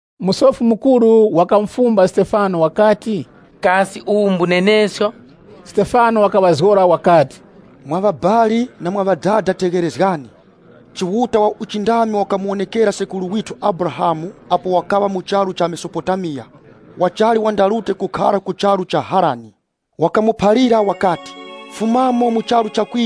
Musofi Mukuru wakamufumba Stefano wakati, “Kasi uwu mbunenesko?” Stefano wakaŵazgora wakati, “Mwa ŵabali na mwa ŵadada, tegherezgani. Chiuta wa uchindami wakamuwonekera sekuru withu Abrahamu apo wakaŵa mu charu cha Mesopotamiya, wachali wandarute kukakhara ku charu cha Harani. Wakamuphalira wakati, ‘Fumamo mu charu chako,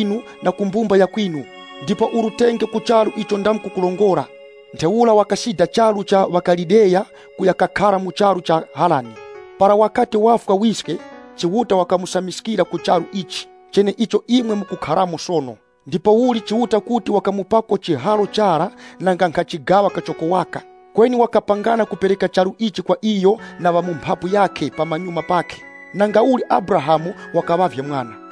na mu ŵabali ŵako ndipo urutenge ku charu icho ndamkukurongora.’ Ntheura wakasida charu cha Babuloni kuya kakhara mu charu cha Harani. Para wakati wafwa wiske, Chiuta wakamusamiskira ku charu ichi, cheneicho imwe mukukharamo sono. Ndipouli Chiuta kuti wakamupako chiharo chara nanga nkha chigaŵa kachoko waka. Kweni wakapangana kupereka charu ichi kwa iyo na ku mphapu yakhe pamanyuma pakhe kuŵa chiharo chawo, nangauli Abrahamu wakaŵavye mwana.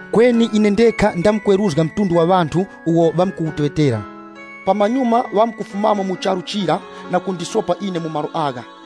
Kweni ine ndekha ndizamkweruzga mtundu wa ŵanthu uwo ŵamkuwuteŵetera. Pamanyuma ŵamkufumamo mu charu chira na kundisopa ine mu malo agha.’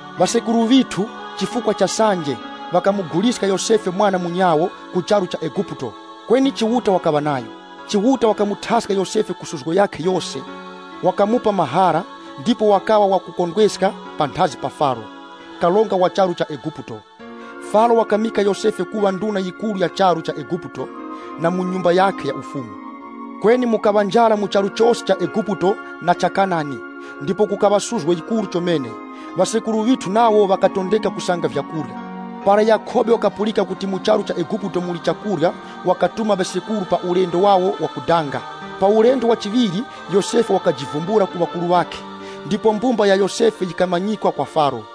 “Ŵasekuru ŵithu, chifukwa cha sanje, ŵakamuguliska Yosefe mwana munyawo, ku charu cha Eguputo. Kweni Chiuta wakaŵa nayo. Chiuta wakamuthaska Yosefe ku suzgo yakhe yose. Wakamupa mahara, ndipo wakaŵa wakukondweska panthazi pa Faro, karonga wa charu cha Eguputo. Faro wakimika Yosefe kuŵa nduna yikuru ya charu cha Eguputo na mu nyumba yakhe ya ufumu. Kweni mukaŵa njara mu charu chose cha Eguputo na cha Kanani, ndipo kukaŵa suzgo yikuru chomene. Ŵasekuru ŵithu nawo ŵakatondeka kusanga vyakurya. Para Yakhobe wakapulika kuti mu charu cha Eguputo muli chakurya, wakatuma ŵasekuru pa ulendo wawo wakudanga. Pa ulendo wa chiŵiri, Yosefe wakajivumbula ku ŵakuru ŵakhe, ndipo mbumba ya Yosefe yikamanyikwa kwa Faro.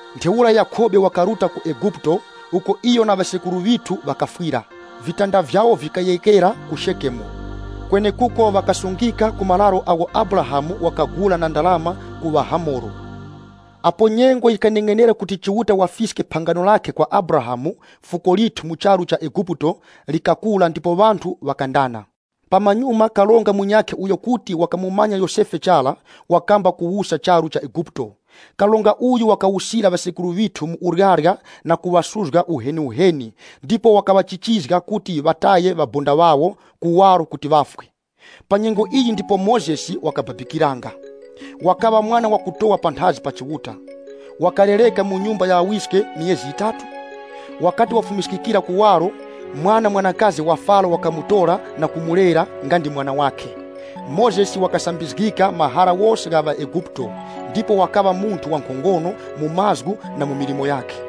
Ntheura Yakhobe wakaruta ku Eguputo, uko iyo na ŵasekuru ŵithu ŵakafwira. Vitanda vyawo vikayeghekera ku Shekemu, kwenekuko ŵakasungika ku mararo agho Abrahamu wakagula na ndarama ku ŵaHamoro. “Apo nyengo yikaneng'enera kuti Chiuta wafiske phangano lakhe kwa Abrahamu, fuko lithu mu charu cha Eguputo likakura ndipo ŵanthu ŵakandana. Pamanyuma karonga munyakhe uyo kuti wakamumanya Yosefe chara, wakamba kuwusa charu cha Eguputo. Karonga uyu wakawusira ŵasekuru ŵithu mu uryarya na kuŵasuzga uheniuheni ndipo wakaŵachichizga kuti ŵataye ŵabonda ŵawo kuwaro kuti ŵafwe. Pa nyengo iyi ndipo Mozesi wakababikiranga. Wakaŵa mwana wakutowa panthazi pa Chiuta. Wakalereka mu nyumba ya ŵawiske myezi yitatu. Wakati wafumiskikira kuwaro, mwana mwanakazi wa Faro wakamutora na kumulera nga ndi mwana wakhe. Mozesi wakasambizgika mahara ghose gha ŵaEguputo, ndipo wakaŵa munthu wankhongono mu mazgu na mu milimo yakhe.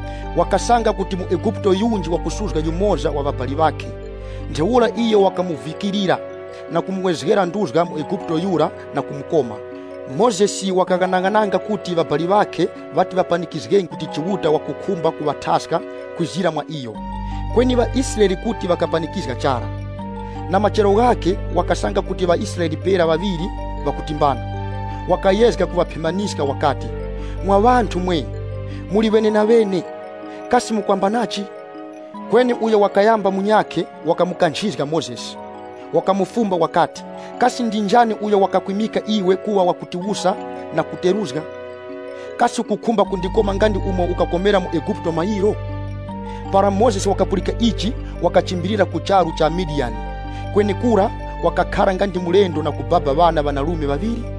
Wakasanga kuti muEguputo yunji wakusuzga yumoza wa ŵabali ŵakhe, ntheura iyo wakamuvikirira, na kumuwezgera nduzga muEguputo yura na kumukoma. Mozesi wakaghanaghananga kuti ŵabali ŵakhe ŵati ŵapanikizge kuti Chiuta wakukhumba kuŵathaska kwizira mwa iyo, kweni ŵaIsraele kuti ŵakapanikizga chara. Na machero ghakhe, wakasanga kuti ŵaIsraele pera ŵaŵiri ŵakutimbana, wakayezga kuŵaphemaniska wakati, ‘Mwa ŵanthu mwe! Imwe muli ŵenenaŵene. Kasi mukwambanachi?’ Kweni uyo wakayamba munyakhe, wakamukanchizga Mozesi, na kuyowoya kuti, ‘Kasi ndi njani uyo wakakwimika iwe kuŵa wakutiwusa na wakuteruzga ise? Kasi ukukhumba kundikoma nga ndi umo ukakomera muEguputo mayiro?’ Para Mozesi wakapulika ichi, wakachimbilira ku charu cha Midiyani. Kwenekura wakakhara nga ndi wamikori na kubaba ŵana ŵanarume ŵaŵiri.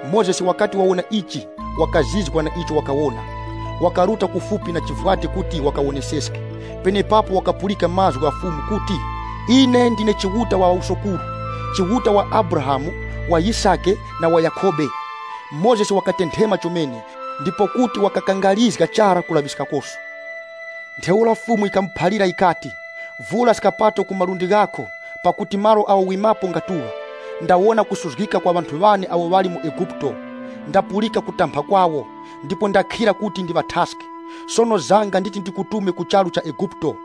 Mozesi wakati wawona ichi, na icho wakawona. Wakaruta kufupi na chivwati kuti wakawoneseske. Penepapo wakapulika mazgu gha Fumu kuti, ‘Ine ndine Chiuta wa ŵawusokuru, Chiuta wa Abrahamu, wa Yisake, na wa Yakhobe.’ Mozesi wakatenthema chomene, ndipo kuti wakakangarizga chara kulaŵiskakoso. Ntheura Fumu yikamuphalira yikati, ‘Vura skapato zako ku malundi ghako, pakuti malo agho wimilirapo ngakupatulika. Ndawona nkhaza izo zikuchitikira ŵanthu ŵane awo ŵali mu Eguputo. Ndapulika kulira kwawo, ndipo ndakhira kuti ndiŵathaske. Sono zanga, nditi ndikutume ku charu cha Eguputo.’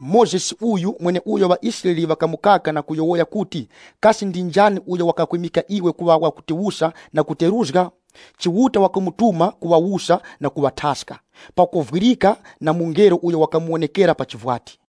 “Mozesi uyu, mweneuyo ŵaIsraele ŵakamukana pakuyowoya kuti, ‘Kasi ndi njani uyo wakakwimika iwe kuŵa wakutiwusa na wakuteruzga ise?’ Chiuta wakamutuma kuŵawusa na kuŵathaska, pakovwirika na mungelo uyo wakamuwonekera mu chivwati.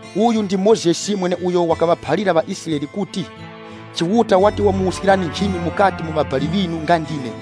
Uyu ndi Mozesi mweneuyo wakaŵaphalira ŵaIsraele kuti, ‘Chiuta wati wamwimikirani nchimi yakuŵa nga ndine mukati mu ŵabali ŵinu.’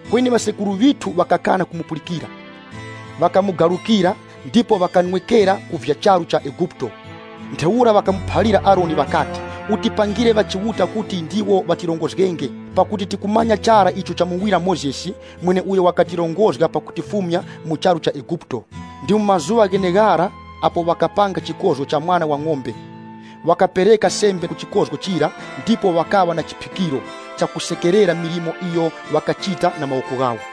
“Kweni ŵasekuru ŵithu ŵakakana kumupulikira. Ŵakamugarukira ndipo ŵakanwekera ku vya charu cha Eguputo. Ntheura ŵakamuphalira Aroni ŵakati, ‘Utipangire ŵachiuta kuti ndiwo ŵatirongozgenge. Pakuti tikumanya chara icho chamuwira Mozesi mweneuyo wakatirongozga pakutifumya mu charu cha Eguputo.’ Ndi mu mazuŵa gheneghara apo ŵakapanga chikozgo cha mwana wa ng'ombe. Ŵakapereka sembe ku chikozgo chira ndipo ŵakaŵa na chiphikiro chakusekerera milimo iyo ŵakachita na mawoko ghawo.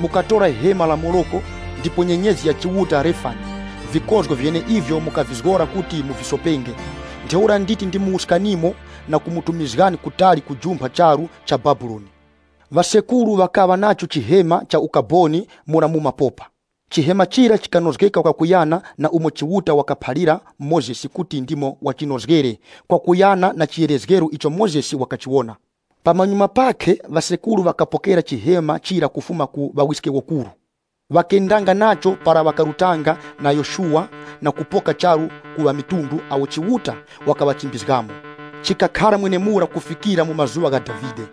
Mukatora hema la Moleki, ndipo nyenyezi ya chiuta Refani, vikozgo vyeneivyo mukavizgora kuti muvisopenge. Ntheura nditi ndimuwuskanimo na kumutumizgani kutali kujumpha charu cha Babuloni.’” “Ŵasekuru ŵakaŵa nacho Chihema cha Ukaboni mura mu mapopa. Chihema chira chikanozgeka kwakuyana na umo Chiuta wakaphalira Mozesi kuti ndimo wachinozgere kwakuyana na chiyerezgero icho Mozesi wakachiwona. Pamanyuma pakhe ŵasekuru ŵakapokera Chihema chira kufuma ku ŵawiskewokuru. Ŵakendanga nacho para ŵakarutanga na Yoshuwa na kupoka charu ku ŵamitundu awo Chiuta wakaŵachimbizgamo. Chikakhara mwenemura kufikira mu mazuŵa gha Davide,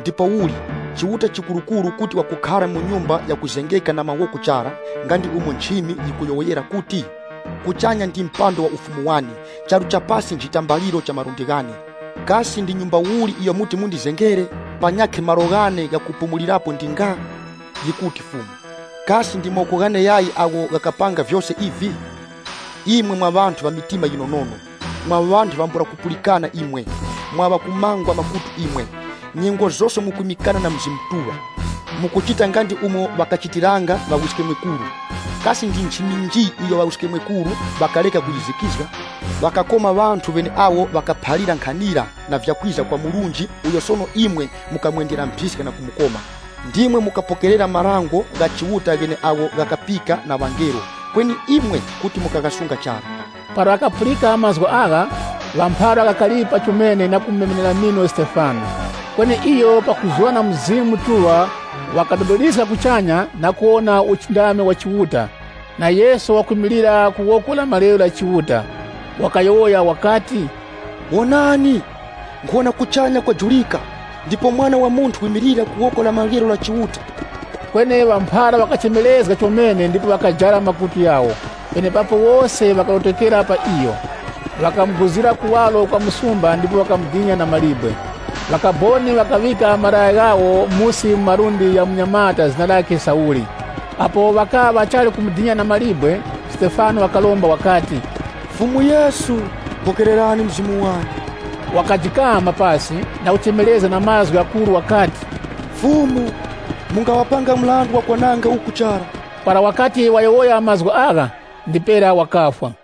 “Ndipouli, Chiuta Chikurukuru kuti wakukhara mu nyumba yakuzengeka na mawoko chara, nga ndi umo nchimi yikuyowoyera kuti, ‘Kuchanya ndi chizumbe chane, charu cha pasi nchitambaliro cha malundi ghane, Kasi ndi nyumba uli iyo muti mundizengere? Panyakhe malo ghane ghakupumulirapo ndi nga? Yikuti Fumu. Kasi ndi mawoko ghane yayi agho ghakapanga vyose ivi?’ “Imwe mwa ŵanthu ŵa mitima yinonono. Mwa ŵanthu ŵambula kupulikana imwe! Mwa ŵa kumangwa makutu imwe! Nyengo zose mukwimikana na Mzimu Mutuŵa. Mukuchita nga ndi umo ŵakachitiranga ŵawiskemwekuru. Kasi ndi nchimi nji iyo ŵawiskemwekuru ŵakareka kuyizikizga? Ŵakakoma ŵanthu ŵeneawo ŵakaphalira nkhanira na vya kwiza kwa Murunji uyo sono imwe mukamwendera mphiska na kumukoma. Ndimwe mukapokerera marango gha Chiuta gheneagho ghakapika na ŵangelo, kweni imwe kuti mukaghasunga chara.” Para ŵa mphara ŵakapulika mazgu agha, ŵakakaripa chomene na kumumemenera mino Stefano. Kweni iyo pakuzura na Mzimu Mutuŵa wakadodoliska kuchanya ndipo wakawona uchindami wa Chiuta, na Yesu wimilira ku woko la maryero la Chiuta. Iyo wakati, “Wonani! Nkhuwona kuchanya kwajurika ndipo Mwana wa Munthu wimilira ku woko la maryero la Chiuta.” Kweni ŵa mphara ŵakachemerezga chomene na kujara makutu ghawo, penepapo wose ŵakarotokera pa iyo. Ŵakamuguzira kuwaro kwa msumba ndipo ŵakamudina na mawe. Ŵakaboni ŵakaŵika malaya ghawo musi mu malundi gha munyamata zina lakhe Sauli Apo ŵakaŵa ŵachali kumudina na mawe, Stefano wakaromba wakati, “Fumu Yesu, pokererani mzimu wane.” Wakajikama pasi na kuchemerezga na mazgu ghakuru wakati, “Fumu, mungaŵapanga mrandu wa kwananga uku chara.” Para wakati wayowoya mazgu agha, ndipera wakafwa.